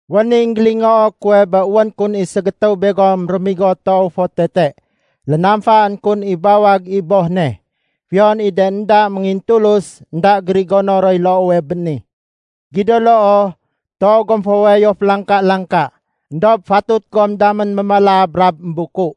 Wén i énggélingoo kuwe bé wén kun i ségétéwe begom réménigo toow fo tete. Lénamfaén kun i bawag i boh ne. Fiyon i de énda méngintulus, énda gérigono roy loowe bé ni. Gido loo, toow gom fo wayo félangka-langka. Endob fatut gom damén mémala brab émbuku.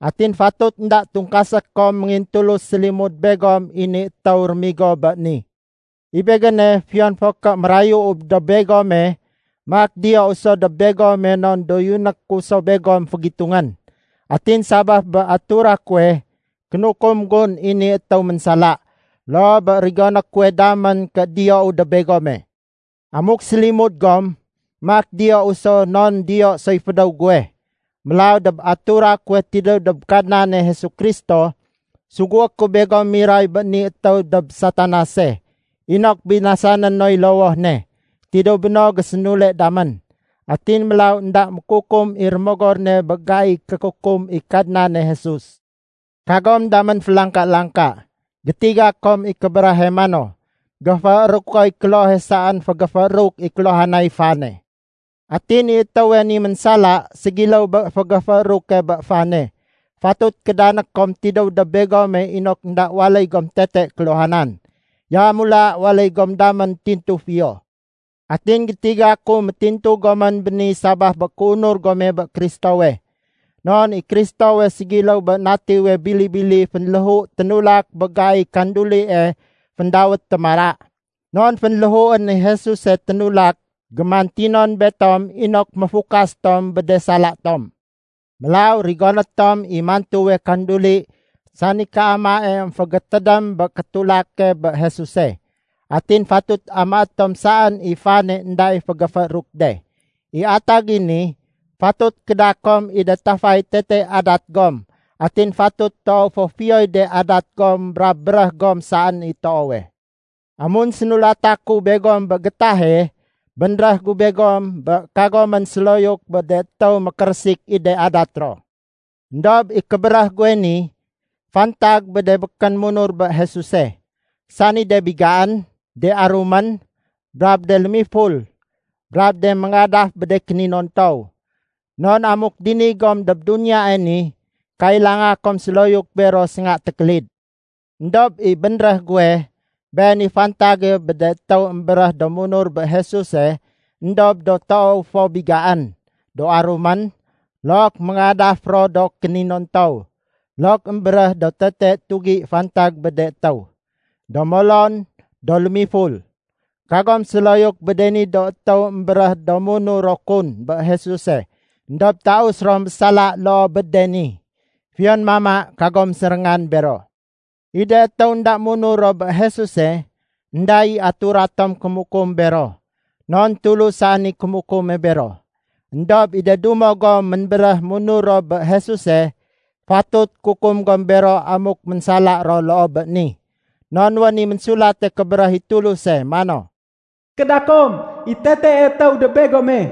Atin fatut énda tungkasé kom méngintulus sélimud begom i ni étéw réménigo bé ni. I begéne, fiyon fo ké mérayuu dob begome maak diyou so dob begome non doyuné ku so begom fégitungén. Atin sabaf bé atura kuwe, kénukum gun i ni étéw ménsala, loo bé rigoné kuwe damén ké diyou dob begome. Amuk sélimud gom, maak diyou so non diyo soy fédéw guwe. Mélaw dob atura kuwe tidéw dob Kadnane Jesu Kristo, sugué ku begom miray bé ni étéw dob Satanase inok binasané noy lowoh ne. Tidéw béno, gésénule damén, atin mélaw énda mékukum i rémogor ne bé gaiy kékukum i Kadnane Jesus. Kagom damén félangka-langka. Gétiga kom i kébéréhe mano, “Géféérukoy klohe saén fégéfééruk i kéluhanay fane.” Atin i étéwe ni ménsala, ségiléw bé fégéfééruke bé fane. Fatut kédané kom tidéw dob begome inok énda waléy gom tete kéluhanan. Yamula waléy gom damén tintu fiyo. Atin gétiga ku méntintu gomén béni sabaf bé kéunur gome bé Kristowe. Non i Kristowe ségiléw bé natiwe bili-bili fénléhu ténulak bé gaiy kandulie féndawét “Témara”. Non fénléhuén i Jesuse ténulak gémantinon betom inok méfukas tom bé de sala tom. Mélaw rigoné tom i mantuwe kanduli sani kéamae émfégétédém bé kétulake bé Jesuse. Atin fatut amaé tom saén i fane énda i fénggéfééruk de. I atag i ni, fatut kéda kom i de tafay tete adat gom atin fatut toow fo fiyoy de adat gom brab béréh gom saén i toowe. Amun sénulata ku begom bé gétahe, bénréh gu begom bé kagomén séloyuk bé de étéw mékérésik i de adat ro. Endob i kébéréh guwe ni, fantag bé de békén munur bé Jesuse, sani de bigaén, de arumén, brab de lémiful, brab de méngadaf bé de kéninontow. Non amuk dini gom dob duniyae ni, kailanga kom séloyuk bero sénga tékélid. Endob i bénréh guwe, been i fantage bé de étéw émbéréh do munur bé Jesuse éndob do toow fo bigaén, do arumén, look méngadaf ro do kéninontow, look émbéréh do tete tugi fantag bé de étéw, do molon, do lémiful. Kagom séloyuk bé de ni do étéw émbéréh do munur ro kun bé Jesuse éndob taus ro mésala loo bé de ni. Fiyon mama, kagom séréngan bero. I de étéw énda munur ro bé Jesuse, énda i atura tom kémukum bero, non Tulus saén i kémukume bero. Endob i de dumo gom ménbéréh munur ro bé Jesuse, fatut kukum gom bero amuk ménsala ro loo bé ni. Non wén i Ménsulate Kébéréh i Tuluse mano, “Kéda kom i tetee étéw dob begome.”